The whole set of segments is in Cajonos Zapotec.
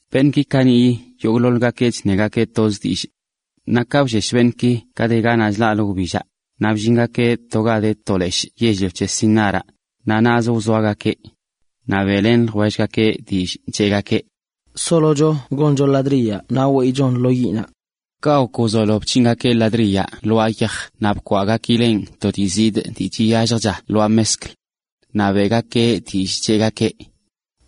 Beṉꞌki kaniꞌyi yogꞌḻoḻgakeꞌ chṉegakeꞌ toz dillꞌ. Naꞌ ka bllesh beṉꞌki ka de ganaꞌ chlaꞌlə wbillaꞌ, naꞌ bllingakeꞌ to ga de to leshꞌ yell-lio c̱he Sinaraꞌ, naꞌ naꞌzə wzoagakeꞌ. Naꞌ beꞌlen ljwellgakeꞌ dillꞌ, cheꞌgakeꞌ: “Solocho goncho ladriyaꞌ naꞌ weyꞌchon lo yiꞌnaꞌ.” Kaꞌ gok wzolo bc̱hingakeꞌ ladriyaꞌ lwaa yaj naꞌ bkwaꞌgakileꞌn to dii zidꞌ(ꞌ) dii chiyalljcha lwaa mezkl. Naꞌ beꞌgakeꞌ dillꞌ, cheꞌgakeꞌ: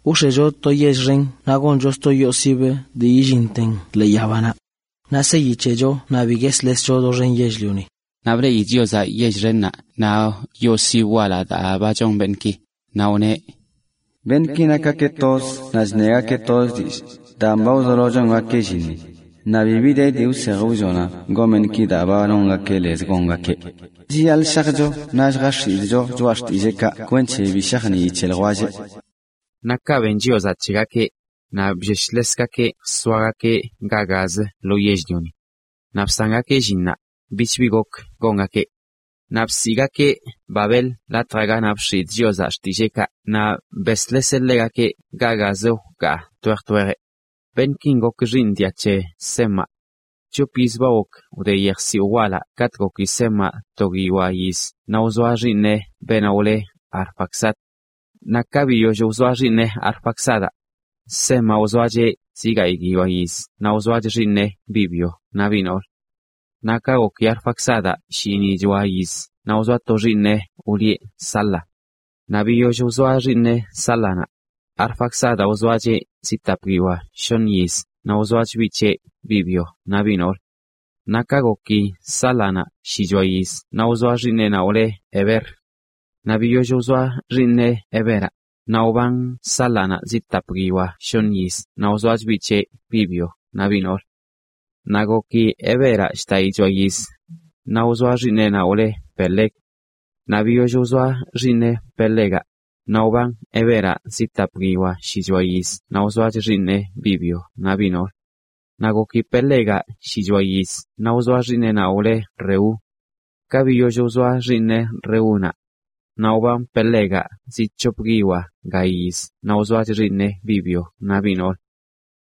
“Wx̱echo to yell xen naꞌ goncho sto yoo sibə dii yillinten ḻee yabanaꞌ. Naꞌ seyi c̱hecho naꞌ bi gueslescho doxen yell-lioni.” Naꞌ bleꞌi Chiozaꞌ yell xennaꞌ naꞌ yoo sibə walaꞌ daa ba chon beṉꞌki, naꞌ wneꞌ: “Beṉꞌki nakgakeꞌ toz naꞌ chṉegakeꞌ toz dillꞌ, daan ba wzolo chongakeꞌ llinni, naꞌ bibi de dii wsej wllonan gon beṉꞌki daa ba nongakeꞌ lez gongakeꞌ. Naꞌ chiyaḻꞌ shajcho naꞌ lljax̱idꞌcho xtilleekaꞌ kwenc̱he bi shajnii c̱he ljwelleꞌ.” Naꞌ kaꞌ ben Chiozaꞌ c̱hegakeꞌ, naꞌ blleshlesgakeꞌ jsoagakeꞌ ga gazə lo yell-lioni. Naꞌ bsangakeꞌ llinnaꞌ, bich bi gok gongakeꞌ. Naꞌ bsiꞌgakeꞌ Babel latjaꞌ ganaꞌ bx̱idꞌ Chiozaꞌ xtilleekaꞌ naꞌ besḻeseꞌ ḻegakeꞌ ga gazə wkaa twej twejeꞌ. Beṉꞌkin gok xiiṉ dia c̱he Semaꞌ. C̱hop yiz ba gok wde yejsiwꞌ walaꞌ katꞌ goki Semaꞌ to guiyoa yiz naꞌ wzoa xiiṉeꞌ beenaꞌ wle Arfaxad. Naꞌ ka biyoll wzoa xiiṉeꞌ Arfaxadaꞌ, Semaꞌ wzoacheꞌ zi gayꞌ guiyoa yiz naꞌ wzoach xiiṉeꞌ, biꞌ byo naꞌ biꞌ noolə. Naꞌ ka goki Arfaxadaꞌ shinꞌichoa yiz naꞌ wzoa to xiiṉeꞌ wlieꞌ Sala. Naꞌ biyoll wzoa xiiṉeꞌ Sálanaꞌ, Arfaxadaꞌ wzoacheꞌ zi tapguiyoa shoṉ yiz naꞌ wzoach biꞌ c̱heꞌ, biꞌ byo naꞌ biꞌ noolə. Naꞌ ka goki Sálanaꞌ shichoa yiz naꞌ wzoa xiiṉeꞌnaꞌ wle Heber. Naꞌ biyoll wzoa xiiṉeꞌ, Heberaꞌ, naꞌ wban Sálanaꞌ zi tap guiyoa shoṉ yiz naꞌ wzoach biꞌ c̱heꞌ, biꞌ byo naꞌ biꞌ noolə. Naꞌ goki Heberaꞌ shdaꞌichoa yiz naꞌ wzoa xiiṉeꞌnaꞌ wle Peleg. Naꞌ biyoll wzoa xiiṉeꞌ Pelegaꞌ, naꞌ wban Heberaꞌ zi tap guiyoa shichoa yiz naꞌ wzoach xiiṉeꞌ, biꞌ byo naꞌ biꞌ noolə. Naꞌ goki Pelegaꞌ shichoa yiz naꞌ wzoa xiiṉeꞌnaꞌ wle Reu. Ka biyoll wzoa xiiṉeꞌ Reúnaꞌ, naꞌ wban Pelegaꞌ zi c̱hop guiyoa ga yiz naꞌ wzoach xiiṉeꞌ, biꞌ byo naꞌ biꞌ noolə.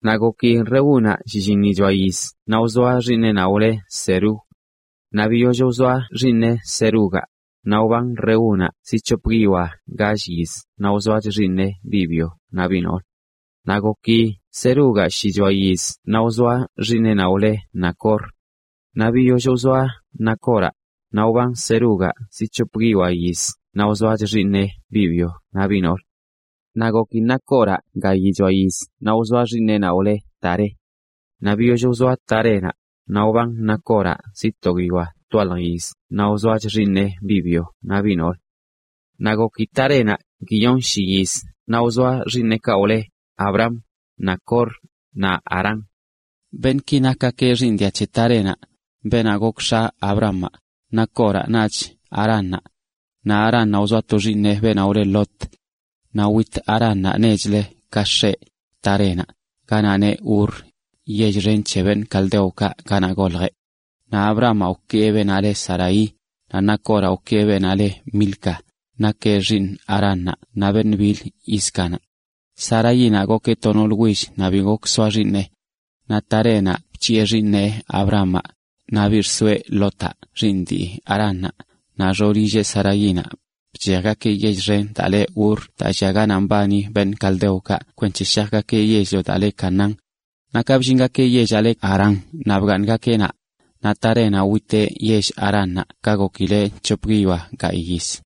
Naꞌ goki Reúnaꞌ shlliṉichoa yiz naꞌ wzoa xiiṉeꞌnaꞌ wle Serug. Naꞌ biyoll wzoa xiiṉeꞌ Serugaꞌ, naꞌ wban Reúnaꞌ zi c̱hop guiyoa gall yiz naꞌ wzoach xiiṉeꞌ, biꞌ byo naꞌ biꞌ noolə. Naꞌ goki Serugaꞌ shichoa yiz naꞌ wzoa xiiṉeꞌnaꞌ wle Nacor. Naꞌ biyoll wzoa Nacoraꞌ, naꞌ wban Serugaꞌ zi c̱hop guiyoa yiz naꞌ wzoach xiiṉeꞌ, biꞌ byo naꞌ biꞌ noolə. Naꞌ goki Nacoraꞌ gaichoa yiz naꞌ wzoa xiiṉeꞌnaꞌ wle Taré. Naꞌ biyoll wzoa Tarénaꞌ, naꞌ wban Nacoraꞌ zi to guiyoa twalj yiz naꞌ wzoach xiiṉeꞌ, biꞌ byo naꞌ biꞌ noolə. Naꞌ goki Tarénaꞌ guiyonshi yiz naꞌ wzoa xiiṉeꞌkaꞌ wle Abram, Nacor, naꞌ Harán. Beṉꞌki nakgakeꞌ xiiṉ dia c̱he Tarénaꞌ, beenaꞌ gok x̱a Abramaꞌ, Nacoraꞌ, naꞌch Haránnaꞌ. Naꞌ Haránnaꞌ wzoa to xiiṉeꞌ beenaꞌ wle Lot. Naꞌ wit Haránnaꞌ nechlə ka x̱eꞌ, Tarénaꞌ, ganaꞌ le Ur, yell xen c̱he caldeokaꞌ ganaꞌ goljeꞌ. Naꞌ Abramaꞌ wkee beenaꞌ le Saraí, naꞌ Nacoraꞌ wkee beenaꞌ le Milca, nakeꞌ xiiṉ Haránnaꞌ naꞌ beṉꞌ bil Íscanaꞌ. Saraínaꞌ gokeꞌ to noolə will naꞌ bi gok soa xiiṉeꞌ. Naꞌ Tarénaꞌ bc̱hiꞌe xiiṉeꞌ Abramaꞌ, naꞌ biꞌ xsoeꞌ Lotaꞌ xiiṉ dii Haránnaꞌ, naꞌ xoolilleꞌ Saraínaꞌ, bchejgakeꞌ yell xen daa le Ur daa llia ganaꞌ mbani caldeokaꞌ kwenc̱he shajgakeꞌ yell-lio daa le Canaán. Naꞌ ka bllingakeꞌ yellaꞌ le Harán naꞌ bgaaṉgakeꞌ naꞌ. Naꞌ Tarénaꞌ witeꞌ yell Haránnaꞌ ka gokileꞌ c̱hop guiyoa gayꞌ yiz.